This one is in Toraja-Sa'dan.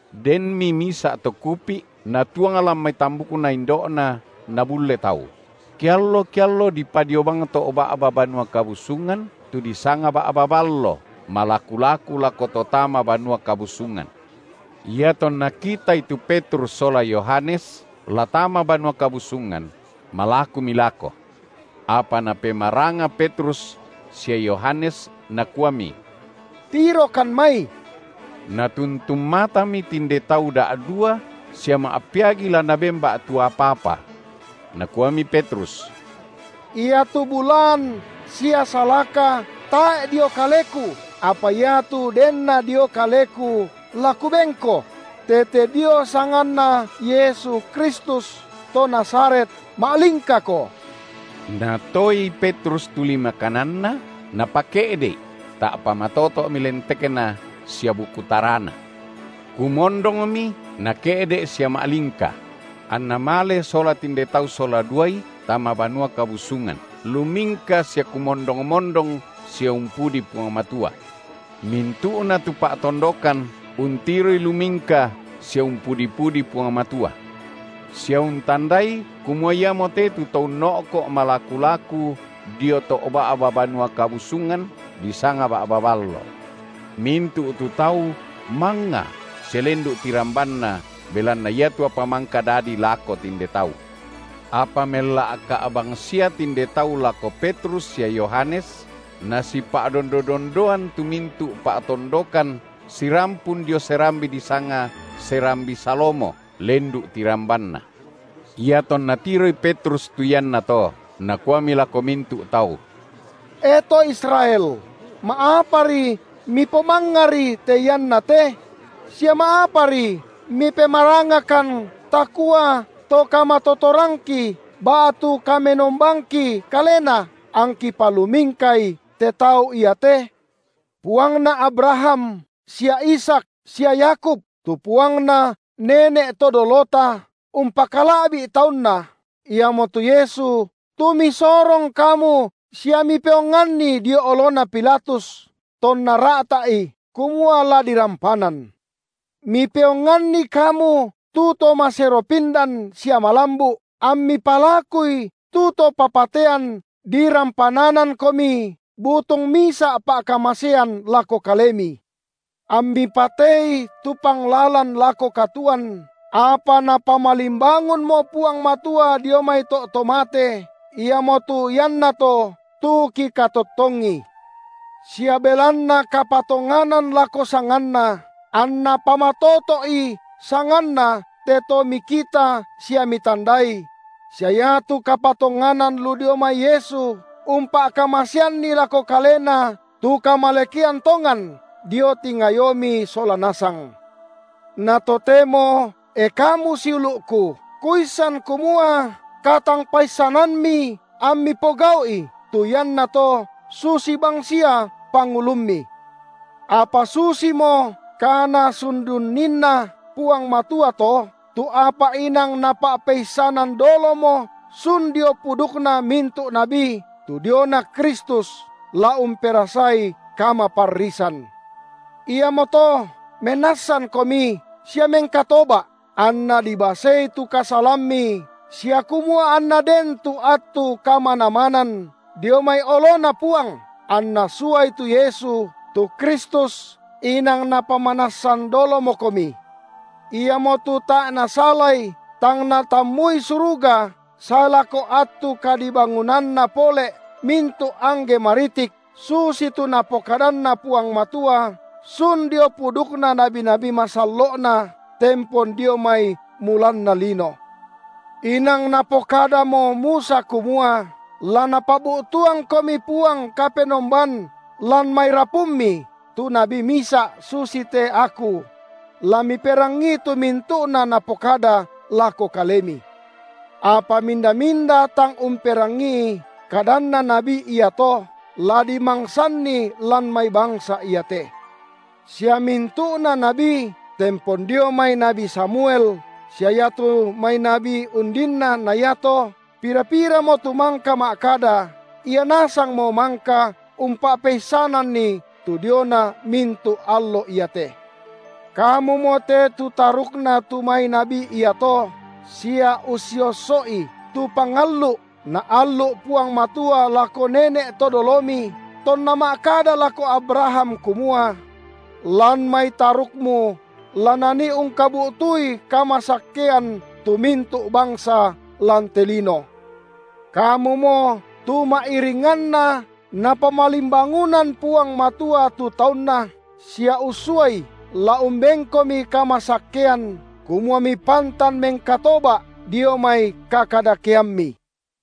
Denmi misa’ to kupi’ natuang lan mai tambukna indo’na nabulle tau; kiallo-kiallo dipadio bang to’ ba’ba Banua Kabusungan, tu disanga Ba’ba Ballo, malaku-laku lako to tama Banua Kabusungan. Iatonna kitai tu Petrus sola Yohanes la tama Banua Kabusungan, malakumi lako. Apa napemaranga Petrus sia Yohanes nakuami: Tirokan mai. Natuntun matami tinde tau da’dua sia ma’peagi la naben ba’tu apa-apa. Nakuami Petrus: Iatu bulaan sia salaka tae’ dio kaleku, apa iatu denna dio kaleku la kubenko: tete dio sanganNa Yesu Kristus, to Nazaret, ma’lingkako! Natoei Petrus tu lima kananna, na pake’de’i; ta’pa matoto’mi lentekna sia buku tarana. Kumondongmi, nake’de’ sia ma’lingka; anna male sola tinde tau sola duai tama Banua Kabusungan, lumingka sia kumondong-mondong sia umpudi Puang Matua. Mintu’na tu pa’tondokan untiroi lumingka sia umpudi-pudi Puang Matua, sia untandai kumua iamote tu to unno’ko’ malaku-laku dio to’ ba’ba Banua Kabusungan, disanga Ba’ba Ballo. Mintu’ tu tau mangnga sia lendu’ tirambanna belanna iatu apa mangka dadi lako tinde tau. Apa mella’ka’ bangsia tinde tau lako Petrus sia Yohanes, nasipa’dondodondoan tu mintu’ pa’tondokan sirampun dio serambi disanga serambi Salomo, lendu’ tirambanna. Iatonna tiroi Petrus tu iannato, nakuami lako mintu’ tau: E to Israel, ma’apari mipomangngari te iannate? sia ma’apari mipemarangakan takua to kamatotorangki ba’tu kamenombangki kalena angki palumingkai te tau iate? Puangna Abraham sia Ishak sia Yakub, tu Puangna nene’ to dolota umpakala’bi’ TaunNa, iamotu Yesu, tu misorong kamu sia mipeoanganni dio olona Pilatus, tonna ra’ta’i kumua la dirampanan. Mipeonganni kamu tu To maseropindan sia malambu’, ammi palakui tu to papatean dirampananankomi butung misa’ pa’kamasean lako kalemi. Ammi patei tu Panglalan lako katuoan, apa Napamalimbangunmo Puang Matua dio mai to’ to mate, iamotu iannato tu kikatottongi. Sia belanna kapatonganan lako sanganNa, anna pamatoto’i sanganNa te to mikita sia mitandai: sia iatu kapatonganan lu dio mai Yesu umpa’kamaseanni lako kalena tu kamalekean tongan dio tingayomi sola nasang. Na totemo, e kamu siulu’ku, kuissan kumua katangpaissanammi ammi pogau’i tu iannato susi bangsia pangulummi. Apa susimo kaNasundunninna Puang Matua to, tu apa inang Napa’peissanan dolomo sun dio pudukna mintu’ nabi tu diona Kristus la umperasai kamaparrisan. Iamoto menassankomi sia mengkatoba’ anna dibasei tu kasalammi sia kumua anna den tu attu kamanamanan dio mai oloNa Puang, anNa suai tu Yesu, tu Kristus inang Napamanassan dolomokomi. Iamo tu tae’ nasalai tang natammui suruga sae lako attu kadibangunanna pole’ mintu’ angge maritik susitu Napokadanna Puang Matua sun dio pudukna nabi-nabi masallo’Na tempon dio mai mulanna lino. Inang Napokadamo Musa kumua: La Napabu’tuangkomi Puang Kapenomban lan mai rapummi tu nabi misa’ susite aku; la miperangii tu mintu’na Napokada lako kalemi. Apa minda-minda tang umperangii kadanna nabi iato, la dimangsanni lan mai bangsa iate. Sia mintu’na nabi tempon dio mai nabi Samuel sia iatu mai nabi undinna na iato, pira-piramo tu mangka ma’kada, ia nasangmo mangka umpa’peissananni tu diona mintu’ allo iate. Kamumo te tu tarukna tu mai nabi iato, sia ussiosso’i tu pangallu’, Naallu’ Puang Matua lako nene’ to dolomi, tonna ma’kada lako Abraham kumua: Lan mai tarukmu la nani ungkabu’tui kamasakkean tu mintu’ bangsa lan te lino. Kamumo tu ma’iringanna Napamalimbangunan Puang Matua tu TaunNa sia ussuaI la umbenkomi kamasakkean, kumua mipantan mengkatoba’ dio mai kakadakeammi.